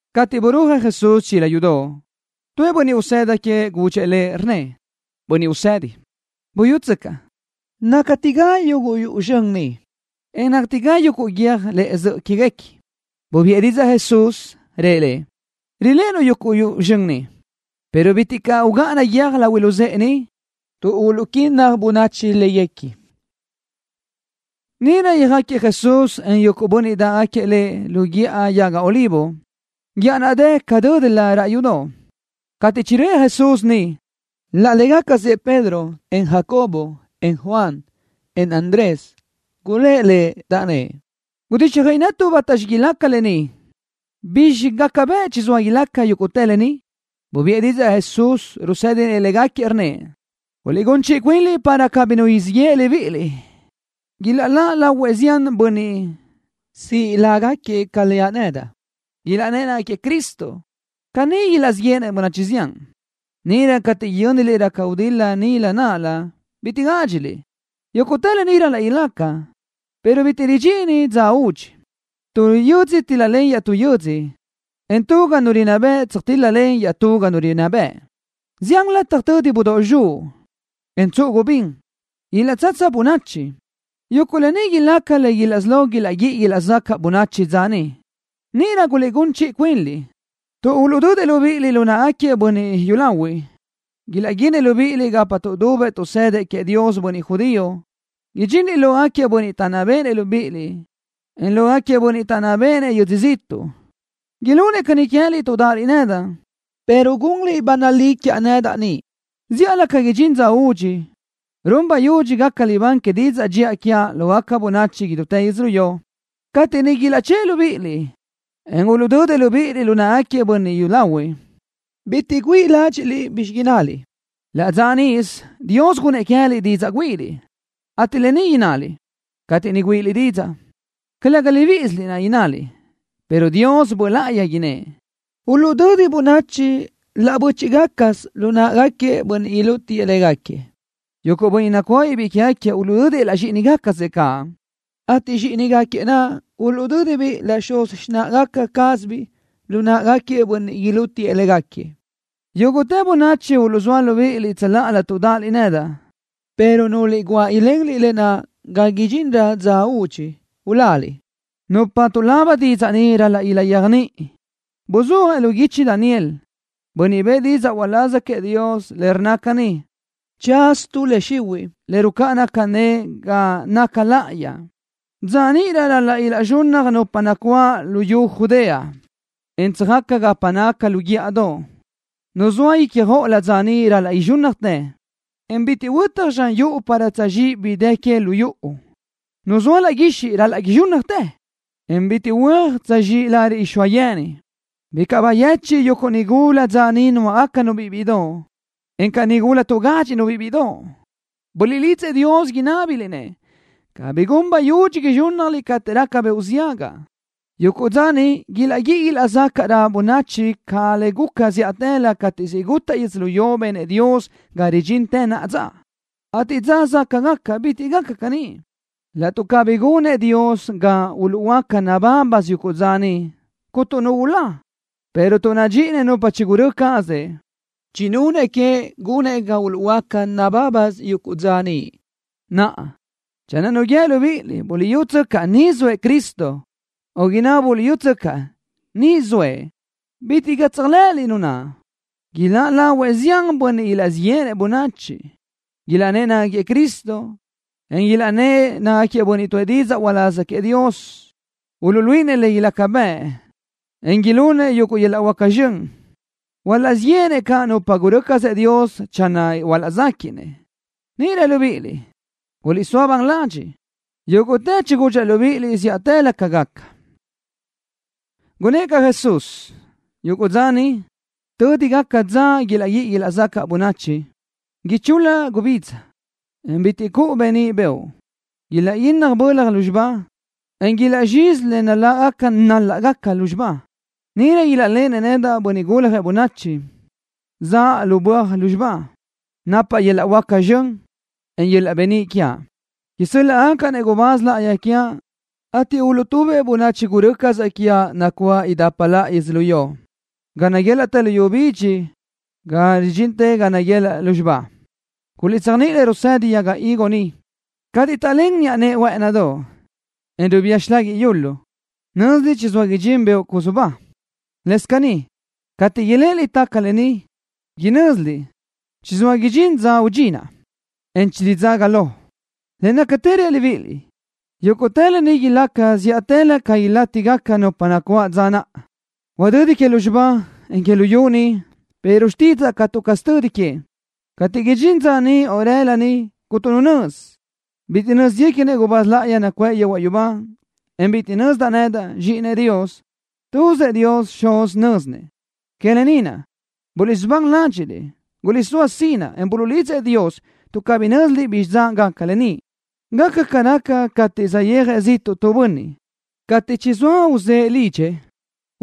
Cateʼ burúajëʼ Jesús chila yudoʼ, tuëʼ bönniʼ usëda queëʼ gudxëʼ Lëʼ, rnnëʼ: —Bönniʼ Usedi, buyútsöcaʼ náctiga yuguʼ yuʼu zxön ni, en náctiga yuguʼ guiö́j lëʼe zöʼö quéguequi. Bubiʼë didzaʼ Jesús, rëʼ lëʼ: —Riléʼenuʼ yuguʼ yuʼu zxön ni, pero bitiʼ caʼ ugáʼana guiö́j lahui luzë́ʼe ni, tuʼ uluʼquínnaj bönachi léguequi. Níʼirö yöjáquiëʼ Jesús, en yuguʼ bönniʼ dáʼgaquiëʼ Lëʼ lu Guíʼa Yaga Olivo, guíʼa naʼ dë ca dö́dilö raʼ yudoʼ. Cateʼ chiröʼë Jesús niʼ, laʼ légacasëʼ Pedro, en Jacobo, en Juan, en Andrés, gulë́ʼ Lëʼ, taʼnnë́ʼ: —Gudíxjöiʼi netuʼ bátaxi ilaca lë ni. ¿Bizxi gaca bëʼ chizóa ilaca yúguʼtë lë ni? Bubiʼë didzaʼ Jesús, rusë́dinëʼ légaquiëʼ, rnnëʼ: —Guliʼgún chiʼi cuinliʼ para cabí nu siʼ yeʼe libíʼiliʼ. Ilaʼláʼ lahuëʼ zián bönniʼ siʼ lágaquiëʼ ca leaʼ nedaʼ, ilaʼnnë́ʼ nácagaquiëʼ Cristo. Caní ilaʼzíʼ yéʼenëʼ bönachi zián. ’Níʼirö cateʼ yö́niliʼ raca gudil-la nilö náʼalö, bitiʼ gádxiliʼ. Yúguʼtë lë ni ral-laʼ ilaca, pero bitiʼ ridxini dza údxi. Tu yödzö tíl-lalen iaʼtú yödzö, en tu ga nu rinná bëʼ tsöjtíl-lalen iaʼtú ga nu rinná bëʼ. Zián lataj tödi budóʼ zxuʼ, en tsuʼu gubín. Ilaʼtsatsa bönachi. Yuguʼ lë ni ilaca le isí lo ilaʼguíʼi ilaʼzacaʼ bönachi dza niʼ. ’Níʼirö guliʼgún chiʼi cuinliʼ, tuʼ uluʼdödëʼ libíʼiliʼ lu náʼagaquiëʼ bönniʼ yúlahuiʼ. Ilaʼguinëʼ libíʼiliʼ gapa tuʼdubëʼ tuʼsëdëʼ queëʼ Dios bönniʼ judío. Idxinliʼ lógaquiëʼ bönniʼ taʼnná béʼenëʼ libíʼiliʼ, en lógaquiëʼ bönniʼ taʼnná béʼenëʼ yödzö ziʼtuʼ. Ilunëʼ caní queë́liʼ tuʼ dáʼaliʼ nedaʼ, pero gunliʼ ba nalí quiaʼ nedaʼ niʼ. Zíʼalö ca idxín dza údxi, run bayudxi gaca libán que didzaʼ dxiʼa quiaʼ lógaca bönachi idútë yödzölió. Cateʼ niʼ ilaʼchë́ʼë libíʼiliʼ, en uluʼdödëʼ libíʼiliʼ lu náʼagaquiëʼ bönniʼ yúlahuiʼ, bitiʼ güíʼi ládxiʼliʼ bizxi innaliʼ. Laʼ dza níʼisö Dios gunnëʼ queë́liʼ didzaʼ güíʼiliʼ, ateʼ lë ni innaliʼ. Cateʼ niʼ güíʼiliʼ didzaʼ, calëga libíʼisiliʼ naʼ innaliʼ, pero Dios Böʼ Láʼayi innë́ʼ. Uluʼdödi bönachi laʼ bö́chiʼgacasö lu náʼagaquiëʼ bönniʼ ilútiëʼ légaquiëʼ. Yuguʼ bönniʼ nacuáʼabiʼ biʼi quégaquiëʼ uluʼdödëʼ laʼ zxíʼinigaca cazëʼ caʼ, ateʼ zxíʼinigaquiëʼ naʼ uluʼdö́dibiʼ laʼ xuz xináʼagaca cázabiʼ lu náʼagaquiëʼ bönniʼ ilútiëʼ légaquiëʼ. Yúguʼtë bönachi uluʼzóa libíʼiliʼ tsöláʼalö tuʼ dáʼaliʼ nedaʼ, pero núlöliʼ guáʼ ilenliʼ lë naʼ ga idxinrö dza údxi, uláliʼ. ’Nupa tuʼlaba didzaʼ ni ral-laʼ ilaʼyéajniʼi. Buzúajëʼ lu guichi Daniel, bönniʼ niʼ bëʼë didzaʼ uláz queëʼ Dios, le rnna caní: “Tsaz tu le xihuiʼ le rucáʼana cané ga naca laʼayi.” Dza níʼirö ral-laʼ ilaʼzxunnaj nupa nacuáʼ luyú Judea, en tsöjaca gapa naca lu guíʼadoʼ. Nu zoa ícjoʼolö dza niʼ ral-laʼ izxúnnajtë, en bitiʼ huötaj zxan yuʼu para tsöjzxíʼ bi dë que lu yuʼu. Nu zoa laʼ guixiʼ ral-laʼ izxúnnajtë, en bitiʼ huö́aj tsöjzxíʼ lariʼ rixóa yeni. Bicaʼ bayechiʼ yuguʼ nigula dza niʼ nuáʼagacanu-biʼ bíʼidoʼ, encaʼ nigula tuʼgádxiʼnu-biʼ bíʼidoʼ. Buliʼlidzëʼ Dios inábiliʼ-nëʼ cabí gun bayudxi izxúnnajliʼ cateʼ raca beoʼ ziaga caʼ. Yuguʼ dza niʼ ilaʼguíʼi ilaʼzacaʼrö bönachi ca le guca zíʼatëlö cateʼ siʼ gutaʼ yödzölió le benëʼ Dios ga ridxintë naʼa dza, ateʼ dza záʼgaca bitiʼ gaca caní. Laʼtuʼ cabí nunëʼ Dios ga uluʼhuöáca nabábasö yuguʼ dza niʼ, cuntu nu ulá, pero tuʼ nadxíʼinëʼ nupa chigurö́ cazëʼ, chinunëʼ queëʼ gunëʼ ga uluʼhuöáca nabábasö yuguʼ dza niʼ. ’Naʼa, channö nu guíë libíʼiliʼ: “Buliʼyútsöcaʼ, ni zoëʼ Cristo”, o inná: “Buliʼyútsöcaʼ, niʼ zoëʼ”, bitiʼ caʼ tséajlëʼëliʼ nu naʼ. Ilaʼláʼ lahuëʼ zián bönniʼ ilaʼzíʼ yéʼenëʼ bönachi. Ilaʼnnë́ʼ nácagaquiëʼ Cristo, en ilaʼnnë́ʼ nácagaquiëʼ bönniʼ tuʼë didzaʼ uláz queëʼ Dios. Uluʼluíʼinëʼ le ilaca bëʼ, en ilunëʼ yuguʼ yöl-laʼ huáca zxön. Hualaʼzíʼ yéʼenëʼ caʼ nupa gurö́ cazëʼ Dios channö ilaʼzéquiʼnëʼ. Níʼirö libíʼiliʼ, guliʼsóa ban ladxiʼ. Yúguʼtë chigudxaʼ libíʼiliʼ zíʼatëlö ca gaca. Gunnë́ʼ caʼ Jesús: —Yuguʼ dza niʼ, tödi gaca dza naʼ ilaʼguíʼi ilaʼzacaʼ caní bönachi, ichul-la gubidza, en bitiʼ cuʼu beníʼ beoʼ. Ilaʼguínnaj bölaj lúzxiba, en ilaʼzxizi le nál-lagaca naláʼgaca lúzxiba naʼ. Níʼirö ilaʼléʼeni nedaʼ, Bönniʼ Guljëʼ Bönachi, zaʼa lu böaj lúzxiba, napaʼ yöl-laʼ huáca zxön, en yöl-laʼ beníʼ quiaʼ. Isö́l-laʼgacaʼ-nëʼ gubáz láʼayi quiaʼ, ateʼ uluʼtubëʼ bönachi gurö́ cazaʼ quiaʼ nacuáʼ idapa laʼa yödzölió, ga naguélaʼtë luyú bidxi, ga ridxintë ga naguelaʼ lúzxiba. ’Guliʼtséajniʼi le rusedi yaga higo niʼ. Cateʼ taʼlén niʼa nëʼe huë́ʼënidoʼ, en rubía xilaguiʼ yulu, nö́ziliʼ chizóa idxín beoʼ cusubá. Lëscaʼ caní, cateʼ iléʼeliʼ taca lë ni, inö́ziliʼ chizóa idxín dza údxi naʼ, en chiridzaga lo. Le nácatë reaʼ libíʼiliʼ, yúguʼtë lë ni ilaca zíʼatëlö ca ilátigaca nupa nacuáʼ dza naʼ. Huadödi que lúzxiba, en que luyú ni, pero xtídzaʼa catu caz tödi que. ’Cateʼ idxín dza niʼ o rëla niʼ, cuntu nu nözi. Bitiʼ nö́zguequinëʼ gubáz láʼayi nacuʼë yehuaʼ yubá, en bitiʼ nözdaʼ nedaʼ, Zxíʼinëʼ Dios. Tuzëʼ Dios Xuz nö́zinëʼ. Que lë ni naʼ, buliʼsubán ládxiʼliʼ. Guliʼsóa sinaʼ, en buliʼlidzëʼ Dios tuʼ cabí nö́ziliʼ bizxi dza gaca lë ni. Gaca ca raca cateʼ saʼyéajëʼ ziʼtuʼ tu bönniʼ. Cateʼ chizóa uzë́ʼë lidxëʼ,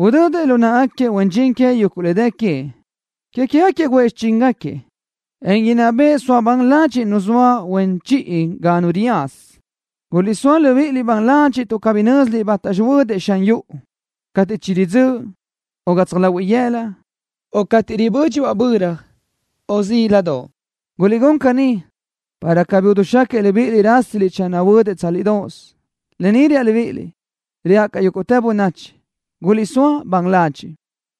udödëʼ lu náʼagaquiëʼ huen dxin queëʼ yuguʼ le dë queëʼ. Que queë́gaquiëʼ guʼë xichíngaquiëʼ, en inná bëʼë soa ban ladxiʼ nu zoa huen chiʼi ga nu riyaza. Guliʼsóa libíʼiliʼ ban ladxiʼ tuʼ cabí nö́ziliʼ bátaxi huödëʼ xan yuʼu, cateʼ chiridzö́ʼ, o gatsaj lahuiʼ yëla, o cateʼ ribö́dxibaʼ böra, o zíladoʼ. Guliʼgún caní, para cabí idixáquiëʼ libíʼiliʼ rásiliʼ channö huödëʼ tsálidoʼos. Lë ni reaʼ libíʼiliʼ, reaʼ caʼ yúguʼtë bönachi: Guliʼsóa ban ladxiʼ.